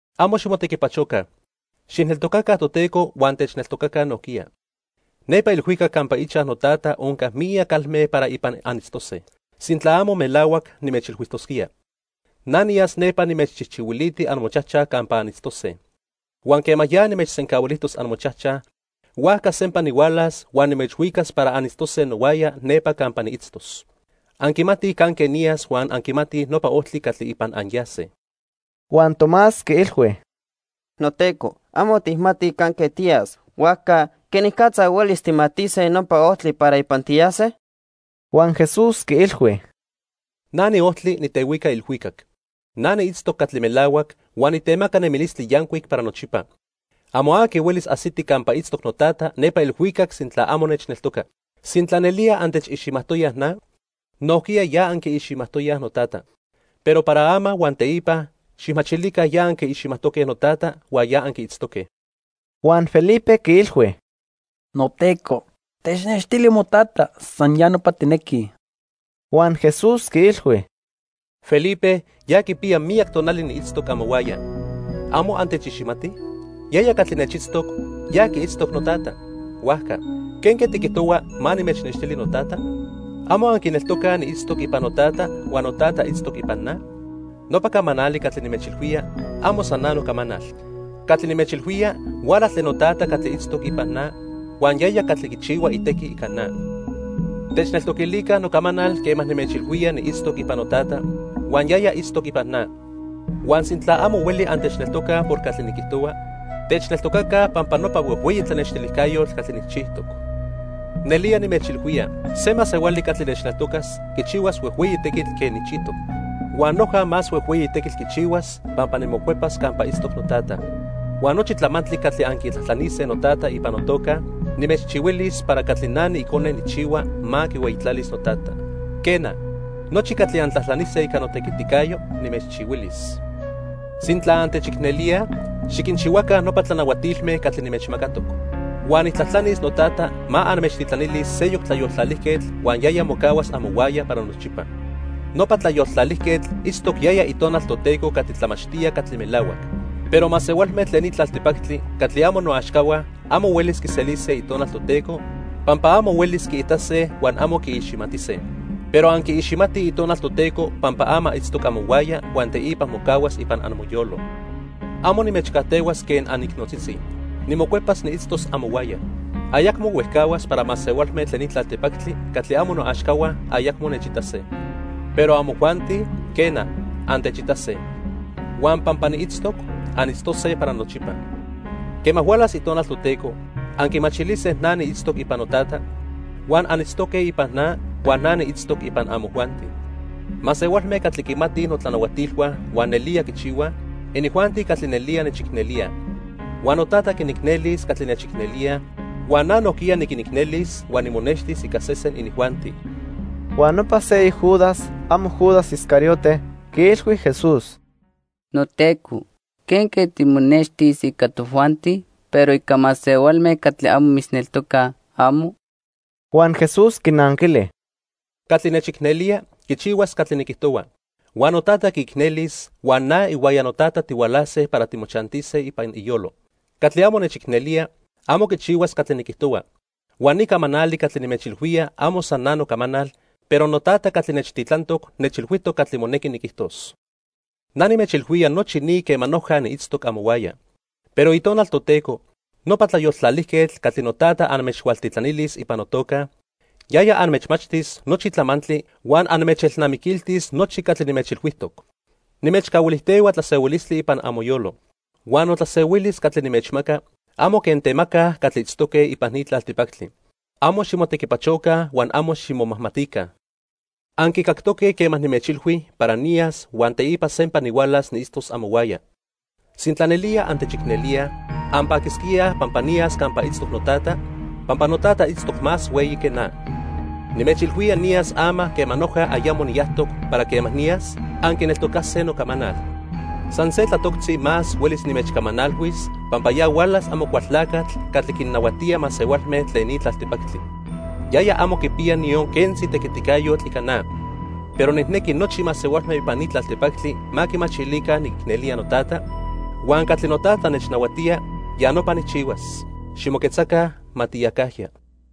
"Amo ximotequipachoca. Xijneltocaca Toteco huan techneltocaca nojquiya. Nepa ilhuicac campa ichaj noTata onca miyac calme para ipan anitztose. Sintla amo melahuac, nimechilhuijtosquía. Na niyas nepa nimechchijchihuiliti amochajchaj campa anitztose. Huan quema ya nimechsencahuilijtos amochajchaj, huajca sempa nihualas huan nimechhuicas para anitztose nohuaya nepa campa niitztos. Anquimatij canque niyas huan anquimatij nopa ojtli catli ipan anyase." Huan Tomás quiilhui: —NoTeco, amo tijmatij canque tiyas, huajca ¿quenicatza huelis tijmatise nopa ojtli para ipan tiyase? Huan Jesús quiilhui: —Na niojtli, nitehuica ilhuicac. Na niitztoc catli melahuac, huan nitemaca nemilistli yancuic para nochipa. Amo aqui huelis ajsiti campa itztoc noTata nepa ilhuicac sintla amo nechneltoca. Sintla nelía antechiximajtoyaj na, nojquiya ya anquiiximajtoyaj noTata. Pero para ama huan teipa xijmachilica ya anquiiximajtoque noTata huan ya anquiitztoque. Huan Felipe quiilhui: —NoTeco, technextili moTata, san ya nopa tijnequij. Huan Jesús quiilhui: —Felipe, ya quipiya miyac tonali niitztoc amohuaya. ¿Amo antechiximatij? Yaya catli nechitztoc, ya quiitztoc noTata. Huajca, ¿quenque tiquijtohua ma nimechnextili noTata? ¿Amo anquineltocaj niitztoc ipan noTata huan noTata itztoc ipan na? Nopa camanali catli nimechilhuía, amo san na nocamanal. Catli nimechilhuía huala tlen noTata catli itztoc ipan na, huan yaya catli quichihua itequi ica na. Techneltoquilica nocamanal quema nimechilhuía niitztoc ipan noTata huan yaya itztoc ipan na. Huan sintla amo hueli antechneltocaj por catli niquijtohua, techneltocaca pampa nopa huejhueyi tlanextilijcayotl catli nijchijtoc. Nelía nimechilhuía, se masehuali catli nechneltocas quichihuas huejhueyi tequitl quen nijchijtoc. Huan noja más huejhueyi tequitl quichihuas pampa nimocuepas campa itztoc noTata. Huan nochi tlamantli catli anquitlajtlanise noTata ipan notoca, nimechchihuilis para catli na niIcone nijchihua ma quihueyitlalis noTata. Quena, nochi catli antlajtlanise ica notequiticayo, nimechchihuilis. "Sintla antechicnelíaj, xiquinchihuaca nopa tlanahuatilme catli nimechmacatoc. Huan nijtlajtlanis noTata ma anmechtitlanilis seyoc Tlayoltlalijquetl huan yaya mocahuas amohuaya para nochipa. Nopa Tlayoltlalijquetl itztoc yaya Itonal Toteco catli tlamachtía catli melahuac. Pero masehualme tlen ni tlaltipactli catli amo noaxcahua amo huelis quiselise Itonal Toteco, pampa amo huelis quiitase huan amo quiiximatise. Pero anquiiximatij Itonal Toteco pampa ama itztoc amohuaya huan teipa mocahuas ipan amoyolo. "Amo nimechcajtehuas quen anicnotzitzi. Nimocuepas niitztos amohuaya. Ayacmo huejcahuas para masehualme tlen ni tlaltipactli catli amo noaxcahua ayacmo nechitase. Pero amojuanti, quena, antechitase. Huan pampa niitztoc, anitztose para nochipa. Quema hualas Itonal Toteco, anquimachilise na niitztoc ipan noTata, huan anitztoque ipan na huan na niitztoc ipan amojuanti. Masehualme catli quimatij notlanahuatilhua huan nelía quinchihuaj, inijuanti catli nelía nechicnelíaj. Huan noTata quinicnelis catli nechicnelíaj, huan na nojquiya niquinicnelis huan nimonextis ica sesen inijuanti." Huan nopa seyoc Judas (amo Judas Iscariote) quiilhui Jesús: —NoTeco, ¿quenque timonextis ica tojuanti, pero ica masehualme catli amo mitzneltocaj, amo? Huan Jesús quinanquili: —Catli nechicnelía, quichihuas catli niquijtohua. Huan noTata quiicnelis huan na ihuaya noTata tihualase para timochantise ipan iyolo. Catli amo nechicnelía, amo quichihuas catli niquijtohua. Huan ni camanali catli nimechilhuía amo san na nocamanal, pero noTata catli nechtitlantoc nechilhuijtoc catli monequi niquijtos. "Na nimechilhuía nochi ni quema noja niitztoc amohuaya. Pero Itonal Toteco, nopa Tlayoltlalijquetl, catli noTata anmechhualtitlanilis ipan notoca, yaya anmechmachtis nochi tlamantli huan anmechelnamiquiltis nochi catli nimechilhuijtoc. "Nimechcahuilijtehua tlasehuilistli ipan amoyolo. Huan notlasehuilis catli nimechmaca amo quen temacaj catli itztoque ipan ni tlaltipactli. Amo ximotequipachoca huan amo ximomajmatica. Anquicactoque quema nimechilhui para niyas huan teipa sempa nihualas niitztos amohuaya. Sintla nelía antechicnelíaj, anpaquisquíaj pampa niyas campa itztoc noTata, pampa noTata itztoc más hueyi que na. Nimechilhuía niyas ama quema noja ayamo niyajtoc para quema niyas, anquineltocase nocamanal. "San se tlatoctzi más huelis nimechcamanalhuis pampa ya hualas Amocualtlacatl catli quinnahuatía masehualme tlen ni tlaltipactli. Yaya amo quipiya niyon quentzi tequiticayotl ica na. Pero nijnequi nochi masehualme ipan ni tlaltipactli ma quimachilica niquicnelía noTata, huan catli noTata nechnahuatía, ya nopa nijchihuas. Ximoquetzaca, ma tiyacajya.